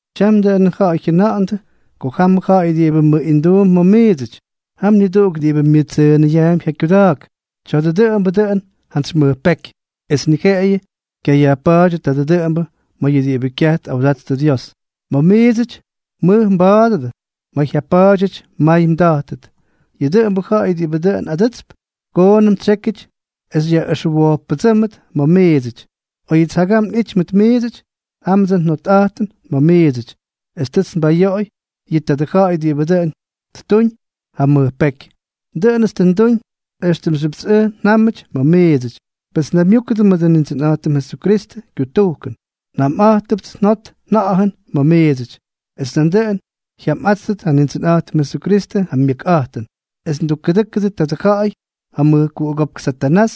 Tyam, dʉꞌʉn ja̱ꞌa̱y jyʉna̱ꞌa̱ndʉ ko jamʉ ja̱ꞌa̱y diꞌibʉ myʉꞌinduump ma̱ miidsʉty, jam niduꞌuk diꞌibʉ myʉttsʉnaapy ja kyuda̱a̱k. Tya̱a̱dʉ dʉꞌʉmbʉ dʉꞌʉn jantsy mʉj peky, es ni jeꞌeyʉ kyayajpa̱a̱ty tadʉ dʉꞌʉmbʉ ma̱ yʉ diꞌibʉ kyaj tꞌawdattʉ Dios. Ma̱ miidsʉty mmʉj mba̱a̱dʉdʉ, ma̱ jyapa̱a̱dyʉty mmay mda̱jtʉt. Yʉ dʉꞌʉmbʉ ja̱ꞌa̱y diꞌibʉ dʉꞌʉn adʉtsp, koonʉm tsyékyʉty es xyꞌʉxwojppʉdsʉ́mdʉt ma̱ miidsʉty. Oyʉts jagam nꞌity mʉt miidsʉty, jámʉts njot nja̱ꞌa̱jʉn ma̱ miidsʉty, es tʉts nbayoꞌoy yʉ tadʉ ja̱ꞌa̱y diꞌibʉ tʉ ttuñ ja mʉj peky. Dʉꞌʉnʉts tʉ nduñ éxtʉmxyʉpts ʉj njámʉty ma̱ miidsʉty. Pes naymyúkʉdʉ mʉdʉ Nindsʉnꞌa̱jtʉm Jesukristʉ kyutujkʉn, njamꞌátʉpts njot nja̱ꞌa̱jʉn ma̱ miidsʉty, es nandʉꞌʉn jyamꞌá̱tʉt ja Nindsʉnꞌa̱jtʉm Jesukristʉ ja myʉkꞌa̱jtʉn, es tukkʉdʉ́kʉdʉ tadʉ ja̱ꞌa̱y ja mʉjkuꞌugópk Satanás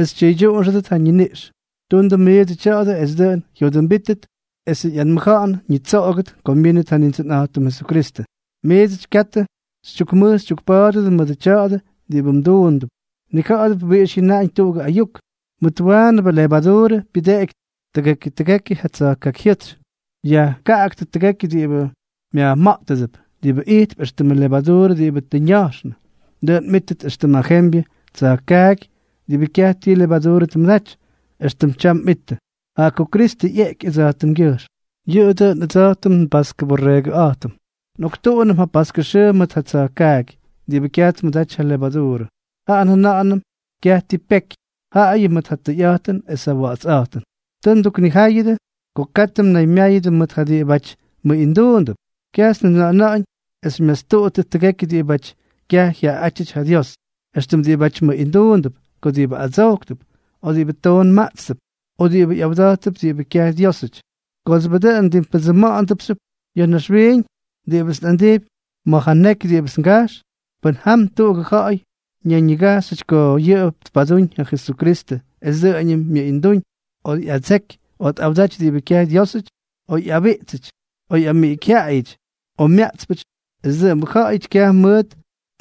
es tyʉydyuꞌunxʉdʉt ja ñiniꞌx. Tundʉ miidsʉ tya̱a̱dʉ es dʉꞌʉn jyodʉmbíttʉt esʉ ꞌyanmʉja̱ꞌa̱n ñitsoꞌogʉt ko myínʉt ja Nindsʉnꞌa̱jtʉm Jesukristʉ. Miidsʉty, katʉ xytyukmʉj xytyukpa̱a̱dʉdʉ mʉdʉ tya̱a̱dʉ diꞌibʉ mduundʉp. Mnija̱ꞌa̱dʉp wiꞌix jyʉnaꞌañ tuꞌugʉ ayuk: “Mʉt waanʉbʉ levaduurʉ pyʉdeꞌeky tʉgekyʉ tʉgekyʉ ja tsa̱jkakyjyʉ́tsy.” Yajkaꞌaktʉ tʉgekyʉ diꞌibʉ myajma̱ꞌtʉdʉp, diꞌibʉ ijtp éxtʉmʉ levaduurʉ diꞌibʉ tʉ ña̱jxnʉ, dʉꞌʉn mꞌíttʉt éxtʉm ja jembyʉ tsa̱jkaaky diꞌibʉ kyaj ti levaduurʉ tmʉdaty, éxtʉm tyam mꞌittʉ, jaꞌa ko Kristʉ ꞌyeꞌky ʉdsa̱jtʉmgyʉjxm. Yʉꞌʉ dʉꞌʉn ʉdsa̱jtʉm nbaskʉ borreegʉꞌa̱jtʉm. Nꞌoktuꞌunʉm ja paskʉ xʉʉ mʉt ja tsa̱jkaaky diꞌibʉ kyaj tmʉdaty ja levaduurʉ. Jaꞌa njʉna̱ꞌa̱nʉm kyaj ti peky, jaꞌayʉ mʉt ja tʉyꞌa̱jtʉn es ja wa̱ꞌa̱tsꞌa̱jtʉn. Tʉ nduknijáyʉdʉ ko katʉ mnaymyáyʉdʉ mʉt ja diꞌibáty mʉꞌinduundʉp. Kyajts njajʉna̱ꞌa̱náñ es xymyastuꞌuttʉt tʉgekyʉ diꞌibáty kyaj jyaꞌaꞌátyʉty ja Dios, éxtʉm diꞌibáty mʉꞌinduundʉp, o diꞌibʉ adsojktʉp, o diꞌibʉ toon maꞌtstʉp, o diꞌibʉ ꞌyawda̱jttʉp diꞌibʉ kyaj Dyiósʉty. Kooxyʉbʉ dʉꞌʉn, mdimpʉdsʉʉmdʉpxyʉp ya̱ naxwiiñ. Diꞌibʉts nꞌandijpy ma̱ ja neky diꞌibʉts ngajx, pʉn jam tuꞌugʉ ja̱ꞌa̱y ñayñigajxyʉty ko yʉꞌʉ tpadúñ ja Jesukristʉ es dʉꞌʉñʉm myʉꞌindúñ, o ꞌyadseky, o tꞌawdaty diꞌibʉ kyaj Dyiósʉty, o ꞌyabiꞌtsʉty, o ꞌyamiꞌikyjyaꞌayʉty, o myaꞌtspʉty, esʉ dʉꞌʉmbʉ ja̱ꞌa̱yʉty kyaj mʉʉt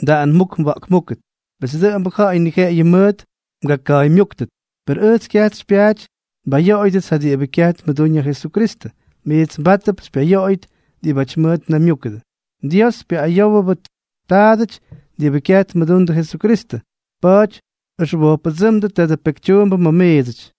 mdaꞌanmúk mwa̱ꞌkmúkʉt. Pes dʉꞌʉmbʉ ja̱ꞌa̱y ni jeꞌeyʉ mʉʉt mgaka̱a̱ymyúktʉt. Per ʉj kyajts xypyaaty nbayoꞌoyʉdʉts ja diꞌibʉ kyaj tmʉdúñ ja Jesukristʉ. Miits mbátʉdʉp xypyayoꞌoyʉt diꞌibáty mʉʉt mnaymyúkʉdʉ. Dios pyayoꞌoyʉbʉ taadʉty diꞌibʉ kyaj tmʉdundʉ Jesukristʉ. Pa̱a̱ty ʉxwojppʉdsʉ́mdʉ tadʉ pekytyuumbʉ ma̱ miidsʉty.